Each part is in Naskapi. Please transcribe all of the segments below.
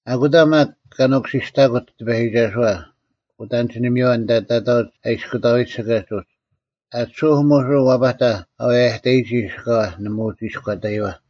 ᐊᑯᑕ ᒪᒃ ᑲ ᓄᑯᓯᔅᑕᑯᑦ ᑎᐸᔨᒋᒐᓱᐛ ᐅᑦ ᐊᒋᓂᒥᔪᐛ ᐊᓐᑕ ᑕᑕᐅᒡ ᐊ ᐃᔅᑯᑕᐎᒡ ᓯᑲᒡ ᐅᒡ᙮ ᐊᑎᓱᐧᒄ ᒧᓱᔅ ᐛᐸᑕᐧᒃ ᐊ ᐛᔭᑕᔨᒋ ᓯᑲᐛ, ᓇᒪ ᐅᒋ ᐃᔎᑕᔪᐛ᙮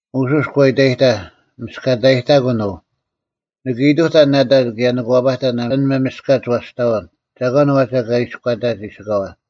ᒧᓱᔅ ᒂ ᐃᑕᔨᑕᐧᒃ, “ᒥᔅᑲᑕᔨᑕᑯᓐ ᐅ! ᓂᑭ ᐃᑐᑕᓐ ᓇᑕ ᑭᔭ ᓂᑭ ᐛᐸᑕᓐ ᐊᓐ ᒪᒥᔅᑲᒡ ᐛᔅᑕᐅᓐ, ᒐᒂᓐ ᐛᒋ ᐊᑲ ᐃᔎᑕᒋ ᓯᑲᐛ?”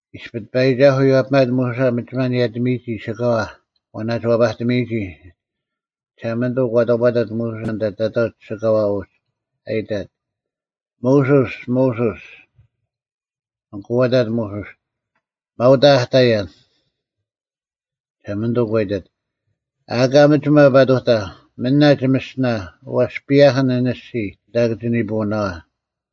ᐃᔅᐱ ᑎᐸᔨᒋᒐᓱᐤ ᐎᔭᐱᒪᑦ ᒧᓱᓴ ᒥᒋᒪ ᓂᔭᑎᒥᔨᒋ ᓯᑲᐛ ᐛ ᓇᒋ ᐛᐸᑎᒥᔨᒋ᙮ ᒋᓴᒪᓂᑐᐤ ᒂ ᑕᑈᑕᑦ ᒧᓱᓴ ᐊᓐᑕ ᑕᑕᐅᒡ ᓯᑲᐛ ᐅᒡ, ᐊ ᐃᑕᑦ, “ᒧᓱᔅ, ᒧᓱᔅ!” ᐊᑯ ᐊᑕᑦ ᒧᓱᔅ, “ᒪᐤ ᐅᑕ ᐊ ᑕᔭᓐ᙮” ᒋᓴᒪᓂᑐᐤ ᒂ ᐃᑕᑦ, “ᐊᑲ ᒥᒋᒪ ᐸᑐᑕ᙮ ᒥᓇ ᒋᒥᔅᒋᓇ, ᐛᔅ ᐸᔭᐧᑭᓐ ᐊᓐ ᐊᔅᒋᔾ ᐊᓐᑕ ᑭᒋ ᓂᐳᐅᓇᐛ᙮”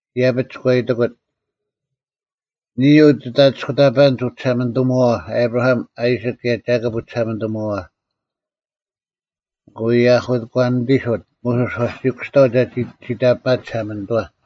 ᐃᔭᐱᒡ ᒂ ᐃᑎᑯᑦ, “ᓂᔾ ᐅ ᒋᑦ ᐊᓂᔅᑯᑕᐸᓐᒡ ᐅᒋᓴᒪᓂᑐᒧᐛᐛ᙮ ᐊᑉᕋᐊᒻ, ᐊᐃᓯᒃ ᑭᔭ ᒐᑭᑉ ᐅᒋᓴᒪᓂᑐᒧᐛᐛ᙮” ᐊᑯ ᐃᔭᑯᐛᓂᑎᓱᑦ ᒧᓱᔅ ᐛᔅ ᒋ ᑯᔅᑕᐤ ᒐᒋ ᒋᑕᐱᒪᑦ ᒋᓴᒪᓂᑐᐛ᙮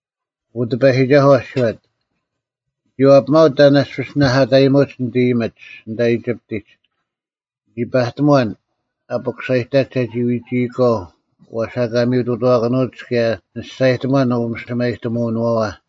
ᐊᑯ ᑎᐸᔨᒋᒐᓱᐤ ᐊᔅᒋᔄᑦ, “ᓂᒋ ᐛᐱᒪᐅᒡ ᑕᓐ ᐊᔅᐱᔅ ᓂᓇᐧᑲᑕᔨᒧᒡ ᓂᑦ ᐃᔨᒥᒡ ᐊᓐᑕ ᐃᒋᑉᑎᒡ᙮ ᓂᒋ ᐸᑎᒺᓐ ᐊ ᐱᑯᓴᔨᑕᒡ ᒐᒋ ᐎᒋᐃᒂᐤ ᐛᔅ ᐊᑲ ᒥᔪᑐᑐᐛᑭᓄᐅᒡ ᑭᔭ ᓂ ᒋᔅᒐᔨᑎᒺᓐ ᐅᒥᓯᒪᐃᑎᒧᐅᓄᐛᐛ᙮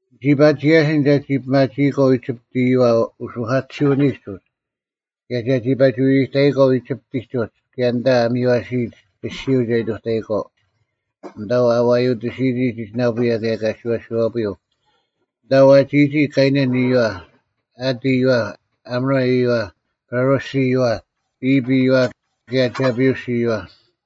ᓂᒋ ᐸᒋ ᔭᓯᓐ ᒐᒋ ᐱᒪᒋᐃᒂᐤ ᐃᒋᑉᑦ ᐃᔪᐛ ᐅᓱᐧᑲᑎᓯᐅᓂᒡ ᐅᒡ ᑭᔭ ᒐᒋ ᐸᒋ ᐎᐎᑕᐃᒂᐤ ᐃᒋᑉᑎᒡ ᐅᒡ ᑭᔭ ᐊᓐᑕ ᐊ ᒥᔽᓯᔨᒡ ᐊᔅᒋᔪᐤ ᒐ ᐃᑐᑕᐃᒂᐤ, ᐊᓐᑕ ᐊ ᐛᔪᑎᓯᔨᒋ ᒋᒋᓇᐳᔭ ᑭᔭ ᑲᓯᐛᓯᐛᐳᔪᐤ, ᐊᓐᑕ ᐛᒋᔨᒋ ᑲᐃᓇᓐ ᐃᔪᐛ, ᐊᑦ ᐃᔪᐛ, ᐊᒧᕆ ᐃᔪᐛ, ᐸᕆᔅ ᐃᔪᐛ, ᐃᑉ ᐃᔪᐛ ᑭᔭ ᒐᐱᐅᔅ ᐃᔪᐛ᙮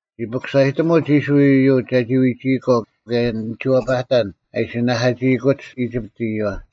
ᒋ ᐱᑯᓴᔨᑎᒧᒡ ᐃᔅᕋᐃᓪ ᐃᔪᒡ ᒐᒋ ᐎᒋᐃᒂᐤ, ᑭᔭ ᓂᒋ ᐛᐸᑕᓐ ᐊ ᐃᓯ ᓇᐧᑲᒋᐃᑯᒡ ᐃᒋᑉᑦ ᐃᔪᐛ᙮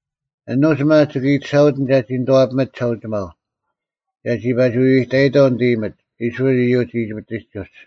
ᐊᓄᒡ ᒪᒃ ᒋᑭ ᐃᑎᓴᐅᑎᓐ ᒐᒋ ᓂᑐᐛᐱᒥᑦ ᒋᓴᐅᒋᒪᐤ, ᒐᒋ ᐸᒋ ᐎᐎᑕᐃᑥᐤ ᓂᑦ ᐃᔨᒥᒡ, ᐃᔅᕋᐃᓪ ᐃᔪᒡ, ᐃᒋᑉᑎᒡ ᐅᒡ᙮”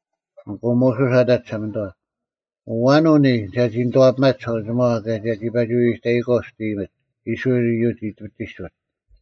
ᐊᑯ ᒧᓱᔅ ᐊᑕᑦ ᒋᓴᒪᓂᑐᐛ, “ᐊᐛᓐ ᐅ ᓂᔾ ᒐᒋ ᓂᑐᐛᐱᒪᑦ ᒋᓴᐅᒋᒪᐛ, ᑭᔭ ᒐᒋ ᐸᒋ ᐎᐎᑕᐃᒂᐤ ᒋᑦ ᐃᔨᒥᒡ, ᐃᔅᕋᐃᓪ ᐃᔪᒡ, ᐃᒋᑉᑎᒡ ᐅᒡ?”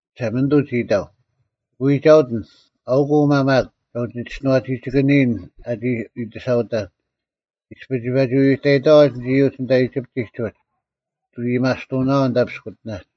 ᒋᓴᒪᓂᑐᐤ ᒋ ᐃᑕᐤ, “ᒋᑭ ᐎᒐᐅᑎᓐ᙮ ᐊᐅᑯᐤ ᐅᒪ ᒪᒃ ᒐ ᐅᒋᔅᒋᓄᐛᒋᒋᑭᓂᔨᓐ ᐊᒋ ᐃᑎᓴᐅᑕᓐ᙮ ᐃᔅᐱ ᒋ ᐸᒋ ᐎᐎᑕᔨᑥᐛ ᐊᓐᒡ ᐃᔪᒡ ᐊᓐᑕ ᐃᒋᑉᑎᒡ ᐅᒡ, ᒋᑭ ᐊᔭᒥᐊᔅᑐᐅᓇᐛᐤ ᐅᑕ ᐱᔅᑯᑎᓇᒡ᙮”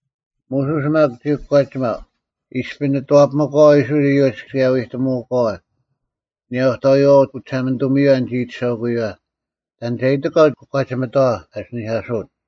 ᒧᓱᔅ ᒪᒃ ᒋ ᑯᒂᒋᒪᐤ, “ᐃᔅᐱ ᓂᑐᐛᐱᒥᒂᐛ ᐃᔅᕋᐃᓪ ᐃᔪᒡ ᑭᔭ ᐎᑎᒧᐅᒂᐛ, ‘ᐊᓂᔭ ᐅᑕᐎᐛᐛ ᐅᒋᓴᒪᓂᑐᒥᔪᐛ ᓂᒋ ᐃᑎᓴᐅᑯᔨᐛ,’ ᑕᓐ ᒐ ᐃᑎᒂᐤ ᑯᒂᒋᒥᑥᐛ ᐊᓯᓂᐧᑲᓱᐅᑦ?”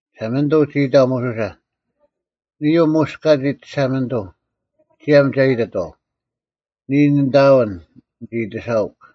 ᒋᓴᒪᓂᑐᐤ ᒋ ᐃᑕᐤ ᒧᓱᓴ, “ᓂᔾ ᐅ ᒧᔅ ᑲᒋᒡ ᒋᓴᒪᓂᑐᐤ᙮ ᒋᔭᒻ ᒐ ᐃᑎᑥᐤ, ‘ᓂᔾ ᓂᑦ ᐊᐎᓐ, ᓂᒋ ᐃᑎᓴᐅᒃ!’”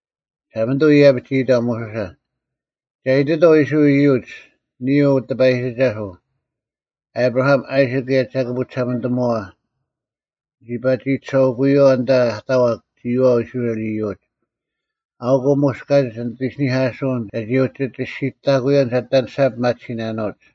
ᒋᓴᒪᓂᑐᐤ ᐃᔭᐱᒡ ᒋ ᐃᑕᐤ ᒧᓱᓴ, “ᒐ ᐃᑎᑥᐤ ᐃᔅᕋᐃᓪ ᐃᔪᒡ, ‘ᓂᔾ ᐅᑎᐸᔨᒋᒐᓱᐤ, ᐊᑉᕋᐊᒻ, ᐊᐃᓯᒃ, ᑭᔭ ᒐᑭᑉ ᐅᒋᓴᒪᓂᑐᒧᐛᐛ, ᓂᒋ ᐸᒋ ᐃᑎᓴᐅᑯᔪᐛ ᐊᓐᑕ ᐊ ᑕᐛᒄ ᒋᔨᐛᐤ ᐃᔅᕋᐃᓪ ᐃᔪᒡ᙮’ ᐊᐅᑯᐤ ᒧᔅ ᑲᒋᒡ ᓂᑦ ᐃᓯᓂᐧᑲᓱᐅᓐ ᒐᒋ ᐅᒋ ᒋᔅᒋᑕᑯᐅᔭᓐ ᒐ ᐊᑎ ᐊᓂᔅᒐ ᐱᒪᑎᓯᓇᓄᐅᒡ᙮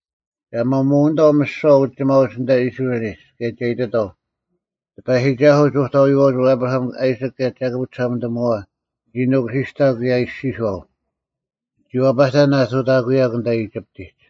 ᒐ ᒪᒧᐅᓂᑥᐤ ᒥᓯᐛ ᐅᒋᒪᐅᒡ ᐊᓐᑕ ᐃᔅᕋᐃᓕᒡ᙮ ᑭᔭ ᒐ ᐃᑎᑥᐤ, ‘ᑎᐸᔨᒋᒐᓱᐤ, ᒍᑕᐎᐛᐅᒡ ᐊᑉᕋᐊᒻ, ᐊᐃᓯᒃ, ᑭᔭ ᒐᑭᑉ ᐅᒋᓴᒪᓂᑐᒧᐛᐛ ᓂᒋ ᓄᑯᓯᔅᑕᒃ ᑭᔭ ᐃᔅᒋᔄᐤ, “ᓂᒋ ᐛᐸᑕᓐ ᐊᑐᑕᑯᐅᔭᒃ ᐊᓐᑕ ᐃᒋᑉᑎᒡ᙮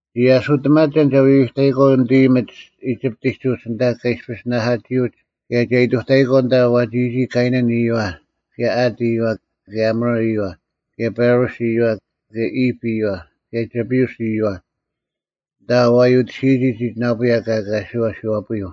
ᓂᒋ ᐊᓱᑎᒪᒐᓐ ᒐ ᐎᐎᑕᐃᒂᐤ ᓂᑦ ᐃᔨᒥᒡ ᐃᒋᑉᑎᒡ ᐅᒡ ᐊᓐᑕ ᑲ ᐃᔅᐱᔅ ᓂᓇᐧᑲᒋᐅᒡ ᑭᔭ ᒐ ᐃᑐᑕᐃᒂᐤ ᐊᓐᑕ ᐛᒋᔨᒋ ᑲᐃᓇᓐ ᐃᔪᐛ ᑭᔭ ᐊᑦ ᐃᔪᐛ ᑭᔭ ᐊᒧᕆ ᐃᔪᐛ ᑭᔭ ᐸᕆᔅ ᐃᔪᐛ ᑭᔭ ᐃᑉ ᐃᔪᐛ ᑭᔭ ᒐᐱᐅᔅ ᐃᔪᐛ, ᐊᓐᑕ ᐊ ᐛᔪᑎᓯᔨᒋ ᒋᒋᓇᐳᔭ ᑭᔭ ᑲᓯᐛᓯᐛᐳᔪᐤ᙮” ’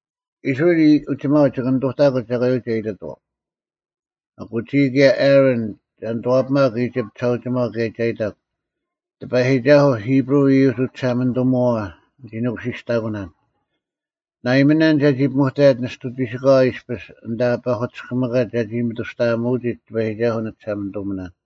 ᐃᔅᕋᐃᓪ ᐅᒋᒪᐅᒡ ᒋᑭ ᓂᑐᑕᑯᒡ ᒐᒂᓂᔪᐤ ᒐ ᐃᑎᑥᐤ᙮ ᐊᑯ ᒋᔾ ᑭᔭ ᐊᕋᓐ ᒐ ᓂᑐᐛᐱᒪᒄ ᐃᒋᑉᑦ ᒋᓴᐅᒋᒪᐤ ᑭᔭ ᒐ ᐃᑕᒄ, ‘ᑎᐸᔨᒋᒐᓱᐤ, ᐃᑉᕈᐤ ᐃᔪᒡ ᐅᒋᓴᒪᓂᑐᒧᐛᐛ ᓂᒋ ᓄᑯᓯᔅᑕᑯᓇᓐ᙮ ᓇᐃᒥᓇᓐ ᒐᒋ ᐱᒧᑕᔭᒡ ᓂᔅᑐᒋᓯᑲᐛ ᐃᔅᐱᔅ ᐊᓐᑕ ᐸᐧᑯᑎᔅᑭᒥᑲᒡ ᒐᒋ ᒥᑐᔅᑕᐊᒧᐅᒋᒡ ᑎᐸᔨᒋᒐᓱᐤ ᓂᒋᓴᒪᓂᑐᒥᓇᓐ᙮’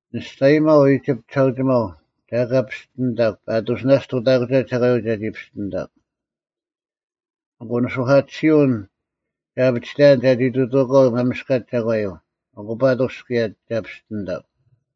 ᓂ ᒋᔅᒐᔨᒪᐤ ᐃᒋᑉᑎᒡ ᒋᓴᐅᒋᒪᐤ ᒐ ᐊᑲ ᐱᔅᑎᓂᑕᒄ ᐸᑐᔅ ᓇᔅᒡ ᑐᑕᑯᒐ ᒐᒂᔪᐤ ᒐᒋ ᐱᔅᑎᓂᑕᒄ᙮ ᐊᑯ ᓂᓱᐧᑲᑎᓯᐅᓐ ᒐ ᐊᐱᒋᑕᔭᓐ ᒐᒋ ᑐᑐᐅᒂᐤ ᒪᒥᔅᑲᒡ ᒐᒂᔪᐤ, ᐊᑯ ᐸᑐᔅ ᑭᔭ ᒐ ᐱᔅᑎᓂᑕᒄ᙮”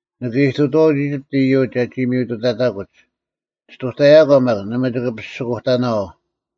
“ᓂᑭ ᐃᑐᑐᐛᐅᒡ ᐃᒋᑉᑦ ᐃᔪᒡ ᒐᒋ ᒥᔪᑐᑕᑯᒡ᙮ ᔅᑐᑕᔭᒂ ᒪᒃ ᓇᒪ ᒋᑭ ᐱᓯᑯᑕᓇᐛᐤ᙮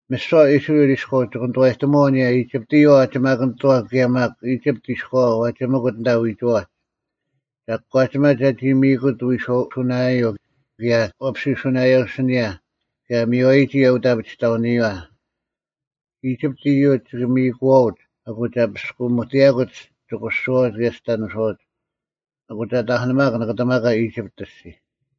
ᒥᓯᐛ ᐃᔅᕋᐃᓪ ᐃᔎᐤ ᒋᑭ ᓂᑐᐛᔨᑎᒧᐛᐤ ᐊᓂᔭ ᐃᒋᑉᑦ ᐃᔪᐛ ᐛᒋᒪᑭᓂᑐᐛᑦ ᑭᔭ ᒪᒃ ᐃᒋᑉᑦ ᐃᔎᐛ ᐛᒋᒥᑯᑦ ᐊᓐᑕ ᐎᒋᐛᒡ᙮ ᒐ ᑯᒂᒋᒪᑦ ᒐᒋ ᒥᔨᑯᑦ ᐎᔄᐅᓱᓇᔭᐤ ᑭᔭ ᐛᐱᓯᐅᓱᓇᔭᐤ ᐊᓯᓂᔭ ᑭᔭ ᐊ ᒥᔽᔨᒋ ᐅᑦ ᐊᐱᒋᑕᐅᓂᔪᐛ᙮ ᐃᒋᑉᑦ ᐃᔪᒡ ᒋᑭ ᒥᔨᑯᐛᐅᒡ ᐊᑯ ᒐ ᐳᔅᑯᒥᑎᔭᑯᒡ ᒋᑯᓯᐛᐅᒡ ᑭᔭ ᒋᑕᓂᓱᐛᐅᒡ᙮ ᐊᐅᑯᐤ ᒐ ᑕᐧᑯᓂᒪᒄ ᓂᑭᑎᒪᒂ ᐃᒋᑉᑦ ᐊᔅᒋᔾ᙮”